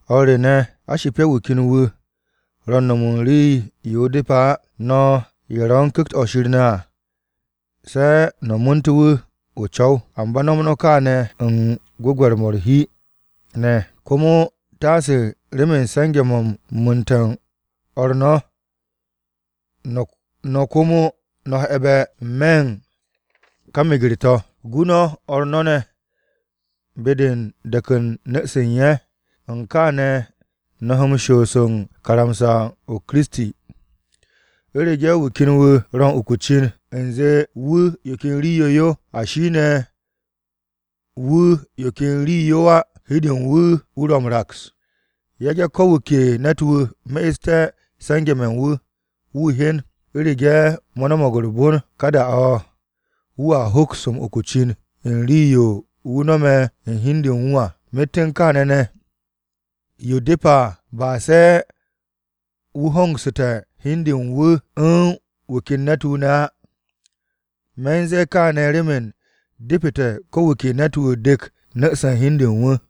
O̱r re ne̱, a shipe̱ wu̱ ken wu̱ ro̱ u̱n no̱m u̱n rii-yo depe̱ á, no̱ ye̱ ro̱ u̱n Ku̱kt-o̱ Shir ne̱ à se̱ no̱ mu̱u̱nte̱ wu̱ n-co̱w. Amba no̱m no̱ kaane̱ u̱n gwu̱gwe̱r-mo̱ u̱r-hi ne̱, komo taase remen se̱nge̱-mo̱ u̱n mu̱u̱nte̱ u̱n o̱r no̱, no̱ komo no̱ he̱be̱ n-me̱ u̱n ka meger-to̱. Gu no̱ o̱r no̱ ne̱ be-de u̱n de̱k u̱n nu̱-se u̱n ye̱. U̱n kaane̱ no̱ he m-shoos u̱n karamsa-o Kiristi. U̱rege̱ wu̱ ken ro̱ u̱n uku o-cin u̱nze wu̱ yo ken rii-yo yo, ashi ne̱ wu̱ yo ken rii-yo yo á, hi u̱n de u̱n wu̱ wu̱ ro̱ m-raks. Yage̱ ko̱ wu̱ ke ne̱t-wu̱ me'este̱ se̱nge̱-mo̱ u̱n wu̱, wu̱ hyen. U̱rege̱ mo̱ no̱mo̱g u̱r-bon, ka da-o̱ wu̱a hoks m-uku o-cin u̱n rii-yo wu̱ no̱me̱ u̱n hi u̱n de u̱n wu̱ à. Myet u̱n kaane̱ ne̱, yo depete̱ ba se wu̱ hongsu̱te̱ hi u̱n de u̱n wu̱ u̱n wu̱ ken u̱n ne̱t-wu̱ ne̱ á. Me̱ u̱n ze̱e̱ kaane̱ remen depete̱ ko wu̱ ke ne̱t-wu̱ dek nu̱-se u̱n hi u̱n de u̱n wu̱.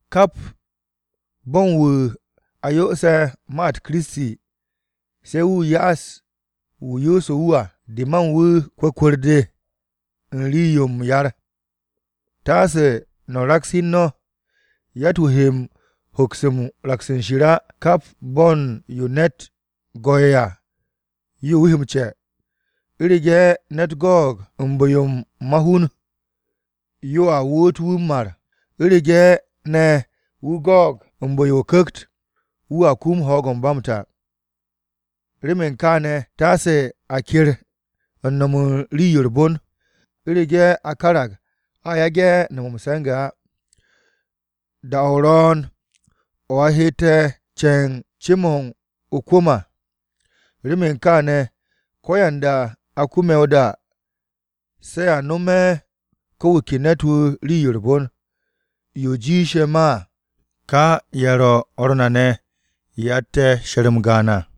Kap bo̱n wu̱ a yoose̱ ma-u̱t Kiristi se̱ wu̱ ya'as wu̱ yoose̱ wu̱ à, de ma u̱n wu̱ kwu̱kwu̱r-de de u̱n rii-yo m-yar. Taase no̱ raks hi u̱n no̱, yatt-wu̱ he m-hoks u̱n raks u̱n Shir á. Kap bo̱n yo ne̱t go̱'e̱ à, yo wu̱ he m-ce̱. U̱rege̱ ne̱t go̱o̱g u̱n bu̱-yo ma-hun, yoa woot wu̱ m-mar. U̱rege̱ ne̱ wu̱ go̱o̱g u̱n bu̱-yo o-Ku̱kt, wu̱a kum ho̱o̱g-mo̱ ba m-ta. Remen kaane̱ taase a ker u̱n no̱m u̱n rii-yo u̱r-bon. U̱rege̱ a karag a yage̱ no̱m m-se̱nge̱ á, da-o ro̱o̱n o̱ a hette̱ ce̱ u̱n ce-mo̱ o-kwu̱m à. Remen kaane̱, ko̱yanda a kume̱ o-da, se̱ a nome̱ ko̱ wu̱ ke ne̱t-wu̱ rii-yo u̱r-bon, yo jiishe̱ ma à, ka ye̱ ro̱ o̱r na ne̱ ye̱ atte̱ she̱r-m gaan à.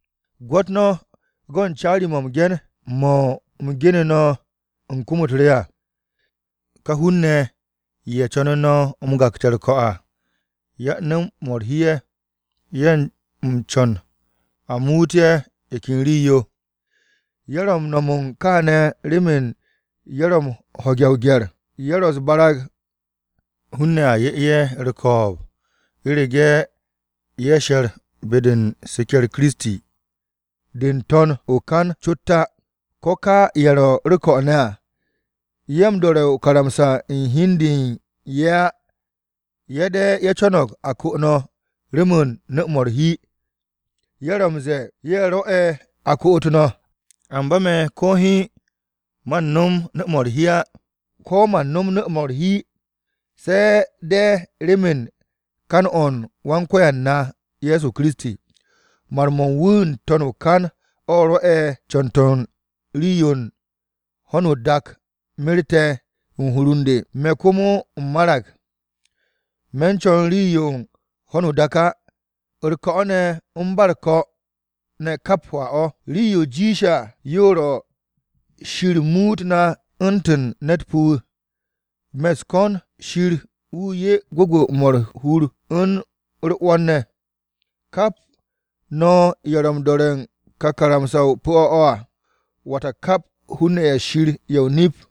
Gwo̱t no̱ go̱n caari-mo̱ m-ge̱n mo̱ u̱m genu̱ no̱ u̱n kom-u̱t re à. Ka hun-ne̱ ye̱ co̱nu̱ no̱ m-gakte̱ u̱r-ko̱ à yan-nu̱-mo̱ u̱r-hi ye̱, ye̱ u̱n co̱n a muut ye̱ yo ken rii-yo. Ye̱ ro̱ m-no̱m kaane̱ remen ye̱ ro̱ m-ho̱ge̱ o-gye̱r. Ye̱ ro̱ u̱s-barag hun-ne̱ a 'ye ye̱ u̱r-ko̱o̱b u̱rege̱ ye̱ she̱r be-de u̱n seke̱-u̱r Kiristi de n-to̱n o-kan cot á. Ko̱ ka ye̱ ro̱ u̱r-ko̱ ne̱ à, ye̱ m-do̱re̱ o-karamsa u̱n hi u̱n de u̱n ye̱ á. Ye̱ de̱ ye̱ co̱no̱g a ko no̱ remen nu̱-mo̱ u̱r-hi, ye̱ ro̱ m-ze̱e̱ ye̱ rwo̱'e̱ a koot no̱. Amba me̱ ko̱ hiin, man no̱m nu̱-mo̱ u̱r-hi á. Ko̱ man nom nu̱-mo̱ u̱r-hi, se̱ de̱ remen kan-o Wan-Ko̱yan na Ye̱so Kiristi. Mar-mo̱ u̱n wu̱ n-to̱n o-kan o̱ rwo̱'e̱ co̱n-to̱ u̱n rii-yo u̱n ho̱no o-dak merte̱ u̱n hur u̱n de. Me̱ komo u̱m marag. Me̱ co̱n rii-yo u̱n ho̱no o-dak á. U̱r-ko̱ ne̱, u̱n ba u̱r-ko̱ ne̱ kap hwaa-o̱. Rii-yo jiishe̱ à yo ro̱ Shir muut na u̱ntu̱n ne̱t pu̱-wu̱. Me̱ u̱s-ko̱n Shir wu̱ 'ye gwu̱gwu̱-mo̱ u̱r-hur u̱r-'wo̱n ne̱. Kap no̱ ye̱ ro̱ m-do̱re̱ u̱n ka karamsa-o pu̱-o̱ o̱ à, wata kap hun-ne̱ ye̱ Shir ye̱ o-nip.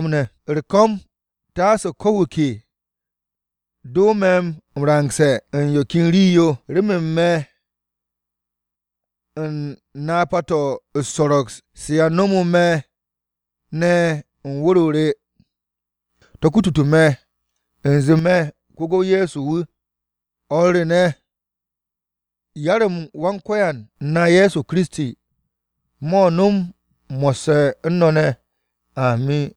U̱r-ko̱m, taase ko̱ wu̱ ke do me̱ m-rangse̱ u̱n yo ken rii-yo, remen me̱ u̱n napa-to̱ u̱s-so̱ro̱g ne̱ se a nomo me̱ u̱n wu̱r-o re à, to̱ kutute̱ u̱nze me̱ ko-gu̱w Ye̱so wu̱. O̱r re ne̱, yar-m Wan-Ko̱yan na Ye̱so Kiristi, mo̱ nom mo̱sse̱ u̱n no̱ ne̱! Amin.